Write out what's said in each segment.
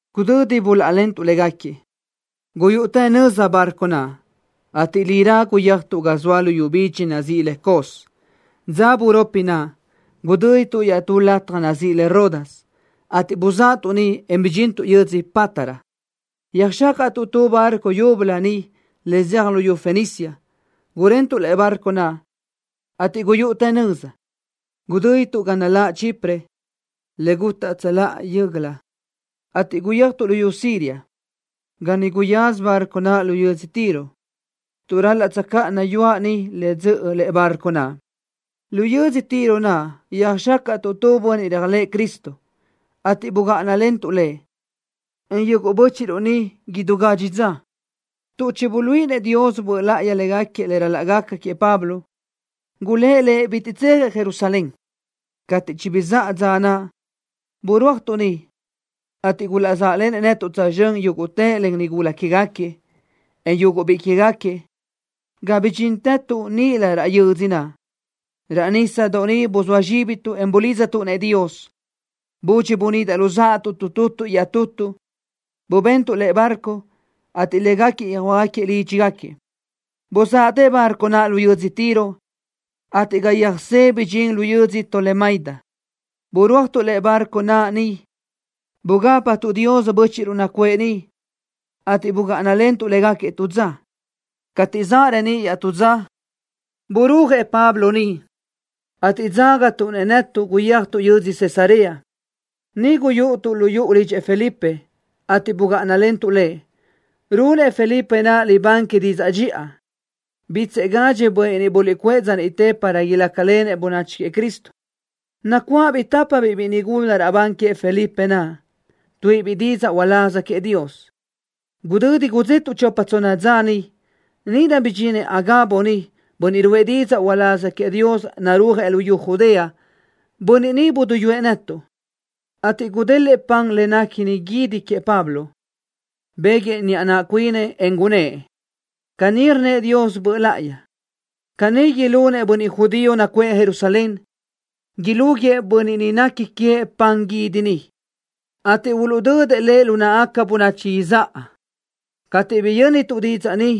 Gudödi buláʼalentuʼ légaquiëʼ, guyúʼutë nöza barco naʼ, ateʼ lirá guyéajtuʼ ga zoa luyú bidxi nazíʼi le Cos. Dza buropi naʼ, gudö́dituʼ iaʼtú lataj nazíʼi le Rodas, ateʼ buzáʼatuʼ niʼ, en bidxintuʼ yödzö Pátara. Yöjxácaʼtuʼ tu barco yúbölö niʼ le zeaj luyú Fenicia. Gurentuʼ lëʼe barco naʼ, ateʼ guyúʼutë nöza. Gudö́dituʼ ga naláʼ Chipre, le gutaʼ tsöláʼa yö́göla, ateʼ guyéajtuʼ luyú Siria, ga niʼ guyaza barco naʼ lu yödzö Tiro, tuʼ ral-laʼ tsöjcáʼana yuaʼ niʼ le dzöʼö lëʼe barco naʼ. Lu yödzö Tiro naʼ yöjxácaʼtuʼ tu bönniʼ réajlëʼë Cristo, ateʼ bugáʼanalentuʼ lëʼ, en yuguʼ bö́chiʼruʼ niʼ idú gadxi dza. Tuʼ chibuluíʼinëʼ Dios Böʼ Láʼayi légaquiëʼ le ral-laʼ gaca queëʼ Pablo, gulë́ʼ lëʼ bitiʼ tsejëʼ Jerusalén. Cateʼ chibizáʼa dza naʼ, burúajtuʼ niʼ, ateʼ gulaʼzáʼlenëʼ netuʼ tsözxö́n yúguʼtëʼ len nigula que queë́gaquiëʼ, en yuguʼ biʼi quégaquiëʼ, ga bidxíntëtuʼ níʼilö raʼ yödzö naʼ. Raʼ nísadoʼ niʼ buzóa zxíbituʼ, en bulidztuʼ-nëʼ Dios. Budxi bunidaʼ luzáʼatuʼ tutuʼ iaʼtutuʼ, bubentuʼ lëʼe barco, ateʼ légaquiëʼ yöjhuö́jgaquiëʼ lídxigaquiëʼ. Buzáʼatë barco naʼ lu yödzö Tiro, ateʼ ga yöjsé bidxín lu yödzö Tolemaida. Burúajtuʼ lëʼe barco naʼ niʼ. Bugápatuʼ Dios bö́chiʼruʼ nacuʼë niʼ, ateʼ bugáʼanalentuʼ légaquiëʼ tu dza. Cateʼ zaʼ reníʼ iaʼtú dza, burúajëʼ Pablo niʼ, ateʼ dzágatuʼ-nëʼ netuʼ guyéajtuʼ yödzö Cesarea. Niʼ guyúʼutuʼ lu yuʼu lidxëʼ Felipe, ateʼ bugáʼanalentuʼ lëʼ. Runëʼ Felipe naʼ libán que didzaʼ dxiʼa. Bítsëʼë gadxëʼ bönniʼ niʼ buluʼcuʼë dza niʼte para ilácalenëʼ bönachi queëʼ Cristo. Nacuáʼabiʼ tapa biʼi nigula raʼbán queëʼ Felipe naʼ, tuíʼibiʼ didzaʼ uláz queëʼ Dios. Gudödi gudzetuʼ chopa tsonna dza niʼ, níʼirö bidxinëʼ Agabo niʼ, bönniʼ ruʼë didzaʼ uláz queëʼ Dios, narúajëʼ luyú Judea. Bönniʼ ni buduyúëʼ netuʼ, ateʼ gudélëʼë pan le néquini guídi queëʼ Pablo. Béguëʼë niʼa naʼ cuinëʼ, en gunnë́ʼ: —Caní rnnëʼ Dios Böʼ Láʼayi: “Caní ilunëʼ bönniʼ judío nacuʼë Jerusalén. Ilúguiëʼ bönniʼ ni nequi queëʼ pan guídi ni, ateʼ uluʼdödëʼ lëʼ lu náʼagaca bönachi izáʼa.” Cateʼ biyö́nituʼ didzaʼ ni,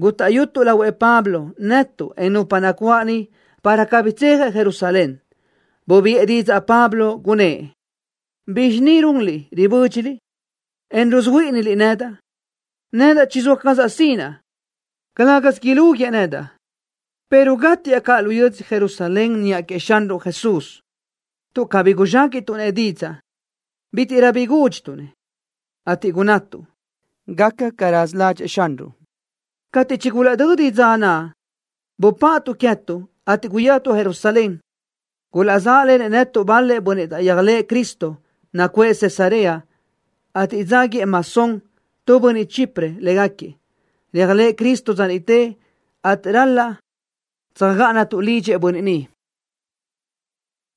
gútaʼyutuʼ lahuëʼ Pablo, netuʼ, en nupa nacuáʼ niʼ, para cabí tsejëʼ Jerusalén. Bubiʼë didzaʼ Pablo, gunnë́ʼ: —¿Bizxi ni runliʼ, ribö́dxiliʼ, en rusuhuíʼiniliʼ nedaʼ? Nedaʼ chizóa cazaʼ sinaʼ, calë́gasö ilúguiëʼ nedaʼ, pero gátiaʼ caʼ lu yödzö Jerusalén niʼa queëʼ Xanruʼ Jesús. Tuʼ cabí guzxéquiʼtuʼ-nëʼ didzaʼ, bítiʼrö bi gúdxituʼ-nëʼ, ateʼ gunnatuʼ: —Gaca ca raza ládxëʼë Xanruʼ. Cateʼ chigulaʼdödi dza naʼ, bupaʼatuʼ queë́tuʼ, ateʼ guyéajtuʼ Jerusalén. Gulaʼzáʼlenëʼ netuʼ bal-lëʼ bönniʼ taʼyéajlëʼë Cristo, nacuʼë Cesarea, ateʼ dzáguiëʼ Mnasón, tu bönniʼ Chipre, légaquiëʼ. Réajlëʼë Cristo dza niʼte, ateʼ ral-laʼ tsöjgáʼanatuʼ lidxëʼ bönniʼ ni.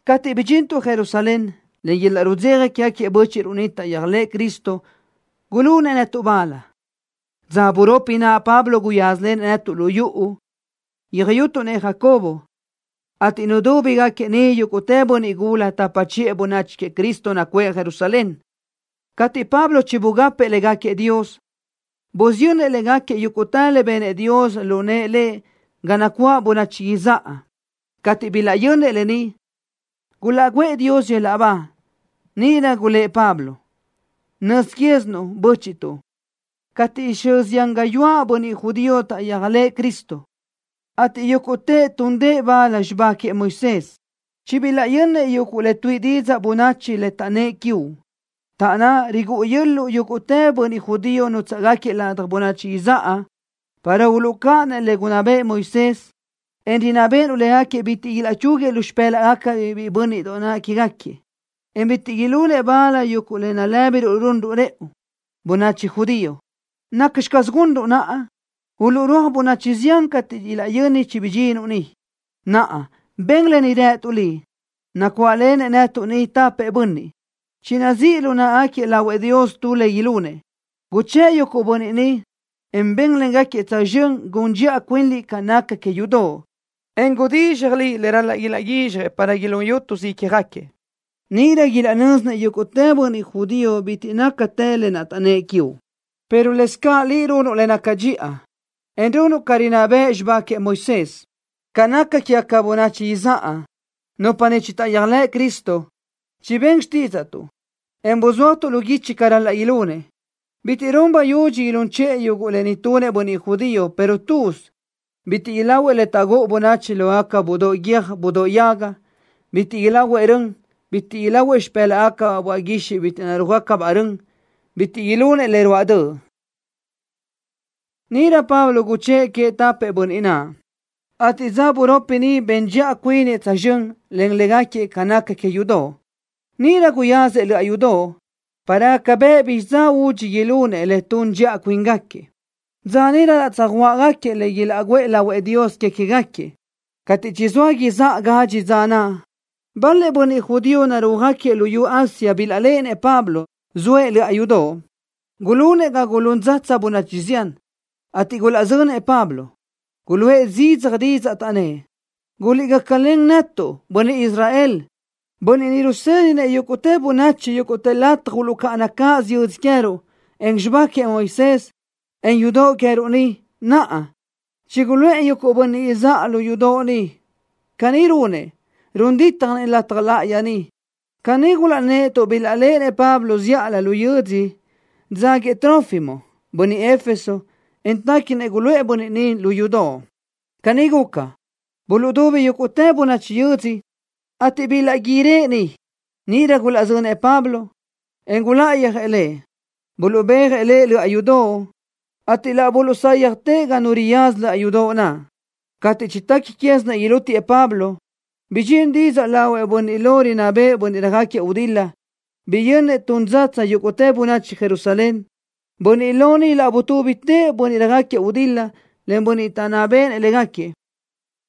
Cateʼ bidxintuʼ Jerusalén, len yöl-laʼ rudzeja quégaquiëʼ bö́chiʼruʼ niʼ taʼyéajlëʼë Cristo gulunëʼ netuʼ bal. Dza buropi naʼ Pablo guyázalenëʼ netuʼ lu yuʼu, yöjyutuʼ-nëʼ Jacobo, ateʼ nudúbigaquiëʼ niʼ yúguʼtë bönniʼ gula tapa chiʼë bönachi queëʼ Cristo nacuʼë Jerusalén. Cateʼ Pablo chibugapëʼ légaquiëʼ Dios, busiyönnëʼ légaquiëʼ yúguʼtë le benëʼ Dios lu nëʼë lëʼ ga nacuáʼ bönachi izáʼa. Cateʼ bilaʼyönnëʼ lë ni, gulaʼguʼë Dios yöl-laʼ ba. Níʼirö gulë́ʼ Pablo: —Nöz quézinuʼ, bö́chiʼtuʼ, cateʼ xö zián gáyuʼë bönniʼ judío taʼyéajlëʼë Cristo, ateʼ yúguʼtëʼ túndëʼë bal xibá queëʼ Moisés. Chibilaʼyönnëʼ yuguʼ le tuíʼi didzaʼ bönachi le taʼnnë́ quiuʼ, taʼnná rigúʼu yö́l-luʼu yúguʼtë bönniʼ judío nútsaʼgaquiëʼ ladaj bönachi izáʼa, para uluʼcáʼanëʼ le gunná bëʼë Moisés, en rinná béʼenuʼ légaquiëʼ bitiʼ ilaʼchúguiëʼ lu xpë́laʼgacabiʼ biʼi bö́nniʼdoʼ quégaquiëʼ, en bitiʼ ilunëʼ bal yuguʼ le nalë́biruʼ runruʼ rëʼu, bönachi judío. ¿Nacxi caz gunruʼ naʼa? Uluʼrúaj bönachi zián cateʼ ilaʼyöni chibidxínuʼ ni. Naʼa, ben lë ni rëtuʼ liʼ. Nacuáʼlenëʼ netuʼ ni tapëʼ bönniʼ, chinazíʼ lu náʼagaquiëʼ lahuëʼ Dios tu le ilunëʼ. Guchë́ʼë yuguʼ bönniʼ ni, en ben légaquiëʼ tsözxö́n gun dxiʼa cuinliʼ ca naca que yudoʼ, en gudizxaj liʼ le ral-laʼ ilaʼguizxjëʼ para ilún yútusö ícjagaquiëʼ. Níʼirö ilaʼnö́zinëʼ yúguʼtë bönniʼ judío bitiʼ nácatë lë naʼ taʼnnë́ʼ quiuʼ, pero lëscaʼ liʼ runuʼ le naca dxiʼa, en runuʼ ca rinná bëʼ xibá queëʼ Moisés. Ca naca quégaca bönachi izáʼa, nupa niʼ chitaʼyéajlëʼ Cristo, chibén xtídzaʼtuʼ, en buzúajtuʼ lu guichi ca ral-laʼ ilunëʼ. Bitiʼ run bayudxi ilún chiʼë yuguʼ lë ni tunëʼ bönniʼ judío, pero tuz: Bitiʼ ilahuëʼ le taʼgúʼu bönachi lógaca budóʼ guiö́j budóʼ yaga. Bitiʼ ilahuëʼ rön. Bitiʼ ilahuëʼ xipë́laʼgacabaʼ böaʼ guixiʼ bitiʼ narúaj-gácabaʼ rön. Bitiʼ ilunëʼ le ruáʼ döʼ. Níʼirö Pablo guchë́ʼë queëʼ tapëʼ bönniʼ naʼ, ateʼ dza buropi niʼ ben dxiʼa cuinëʼ tsözxö́n len légaquiëʼ ca naca que yudoʼ. Níʼirö guyáziëʼ löʼa yudoʼ, para gaca bëʼ bizxi dza údxi ilunëʼ le tuʼún dxiʼa cuíngaquiëʼ, dza niʼ ral-laʼ tsöjuáʼagaquiëʼ le ilaʼguʼë lahuëʼ Dios que queë́gaquiëʼ. Cateʼ chizóa izáʼa gadxi dza naʼ, bal-lëʼ judío narúajgaquiëʼ luyú Asia bilaʼléʼenëʼ Pablo, zoëʼ löʼa yudoʼ. Gulunëʼ ga gulún dzatsa bönachi zián, ateʼ gulaʼzönëʼ Pablo. Guluʼë zidzaj didzaʼ, taʼnnë́ʼ: —¡Guliʼgácalen netuʼ, bönniʼ Israel! Bönniʼ ni rusédinëʼ yúguʼtë bönachi yúguʼtë lataj uluʼcáʼana cáʼasö yödzö queë́ruʼ, en xibá queëʼ Moisés, en yudoʼ queë́ruʼ ni. Naʼa, chiguluʼë yuguʼ bönniʼ izáʼa lu yudoʼ ni. Caní runëʼ, run dítjanëʼ lataj láʼayi ni. Caní gulaʼnnë́ʼ tuʼ bilaʼléʼenëʼ Pablo zíʼalö lu yödzö dzáguiëʼ Trófimo, bönniʼ Éfeso, en téquinëʼ guluʼë bönniʼ ni lu yudoʼ. Caní guca, buluʼdubi yúguʼtë bönachi yödzö, ateʼ bilaʼguírëʼ niʼ. Níʼirö gulaʼzönëʼ Pablo, en guláʼayöjëʼ lëʼ, buluʼbéajëʼ lëʼ löʼa yudoʼ, ateʼ laʼ buluʼsáyjatëʼ ga nu riyaza löʼa yudoʼ naʼ. Cateʼ chitequi quézinëʼ ilútiëʼ Pablo, bidxín didzaʼ lahuëʼ bönniʼ lo rinná béʼenëʼ bönniʼ röjáquiëʼ gudil-la. Biyönnëʼ tun dzatsa yúguʼtë bönachi Jerusalén. Bönniʼ lo ni laʼ butúbitëʼ bönniʼ röjáquiëʼ gudil-la, len bönniʼ taʼnná béʼenëʼ légaquiëʼ,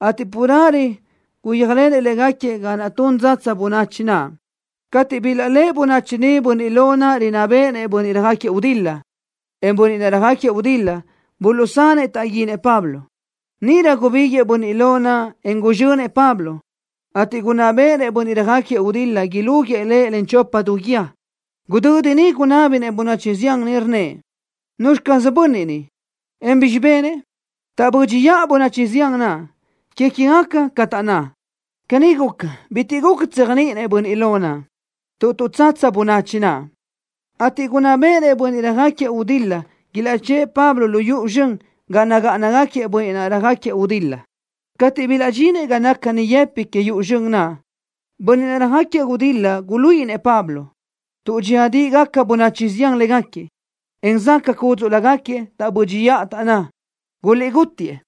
ateʼ carelö guyéajlenëʼ légaquiëʼ ga naʼ tun dzatsa bönachi naʼ. Cateʼ bilaʼléʼe bönachi niʼ bönniʼ lo naʼ rinná béʼenëʼ bönniʼ röjáquiëʼ gudil-la, en bönniʼ naʼ röjáquiëʼ gudil-la, buluʼsanëʼ taʼguinëʼ Pablo. Níʼirö gubíguiʼë bönniʼ lo naʼ, en guzxönëʼ Pablo, ateʼ gunná béʼenëʼ bönniʼ röjáquiëʼ gudil-la ilúguiëʼ lëʼ len chopa du guíë. Gudödi niʼ gunábinëʼ bönachi zián niʼ, rnnëʼ: —¿Nuzxi caz bönniʼ ni, en bizxi benëʼ? Taʼbö́dxiʼa bönachi zián naʼ, que queë́gaca ca taʼnná. Caní guca, bitiʼ bi guca tséajniʼinëʼ bönniʼ lo naʼ, tuʼ tuʼtsatsa bönachi naʼ, ateʼ gunná béʼenëʼ bönniʼ röjáquiëʼ gudil-la ilaʼchë́ʼë Pablo lu yuʼu zxön ga nagáʼanagaquiëʼ bönniʼ naʼ röjáquiëʼ gudil-la. Cateʼ bilaʼdxinëʼ ga naca niʼyëpiʼ que yuʼu zxön naʼ, bönniʼ naʼ röjáquiëʼ gudil-la guluíʼinëʼ Pablo, tuʼ dxíadiʼigaca bönachi zián légaquiëʼ, en záʼgaca cúdzuʼlögaquiëʼ, taʼbö́dxiʼa, taʼnná: —Guliʼgútiëʼ.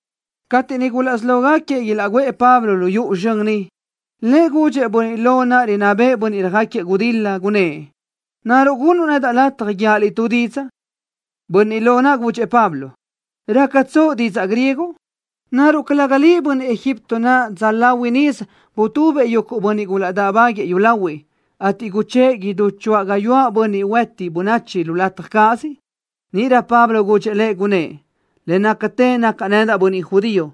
Cateʼ niʼ gulaʼsí lógaquiëʼ ilaʼguʼë Pablo lu yuʼu zxön niʼ, lëʼ gudxëʼ bönniʼ lo naʼ rinná béʼenëʼ bönniʼ röjáquiëʼ gudil-la, gunnë́ʼ: —¿Naruʼ gunnuʼ nedaʼ lataj guíaʼ liʼ tu didzaʼ? Bönniʼ lo naʼ gudxëʼ Pablo: —¿Rácatsoʼ didzaʼ griego? ¿Naruʼ calëga liʼ bönniʼ Egipto naʼ dza lahui nisö butubëʼ yuguʼ bönniʼ gulaʼdáʼbaguëʼë yúlahuiʼ, ateʼ guchë́ʼë idú choáʼ gáyuʼë bönniʼ huëti bönachi lu lataj cáʼasö? Níʼirö Pablo gudxëʼ lëʼ, gunnë́ʼ: —Le nácatë nacaʼ nedaʼ bönniʼ judío.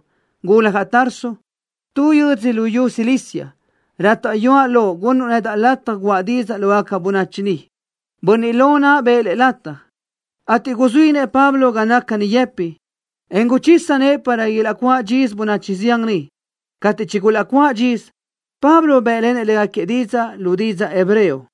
Guljaʼ Tarso, tu yödzö lo luyú Cilicia. Rátaʼyuaʼ loʼ gunnuʼ nedaʼ lataj guʼa didzaʼ lógaca bönachi ni. Bönniʼ lo naʼ bëʼë lëʼ lataj, ateʼ guzuínëʼ Pablo ga naca niʼyëpiʼ, en guchisa nëʼë para ilaʼcuáʼ dxisö bönachi zián niʼ. Cateʼ chigulaʼcuʼë dxisö, Pablo bë́ʼlenëʼ légaquiëʼ didzaʼ lu didzaʼ hebreo.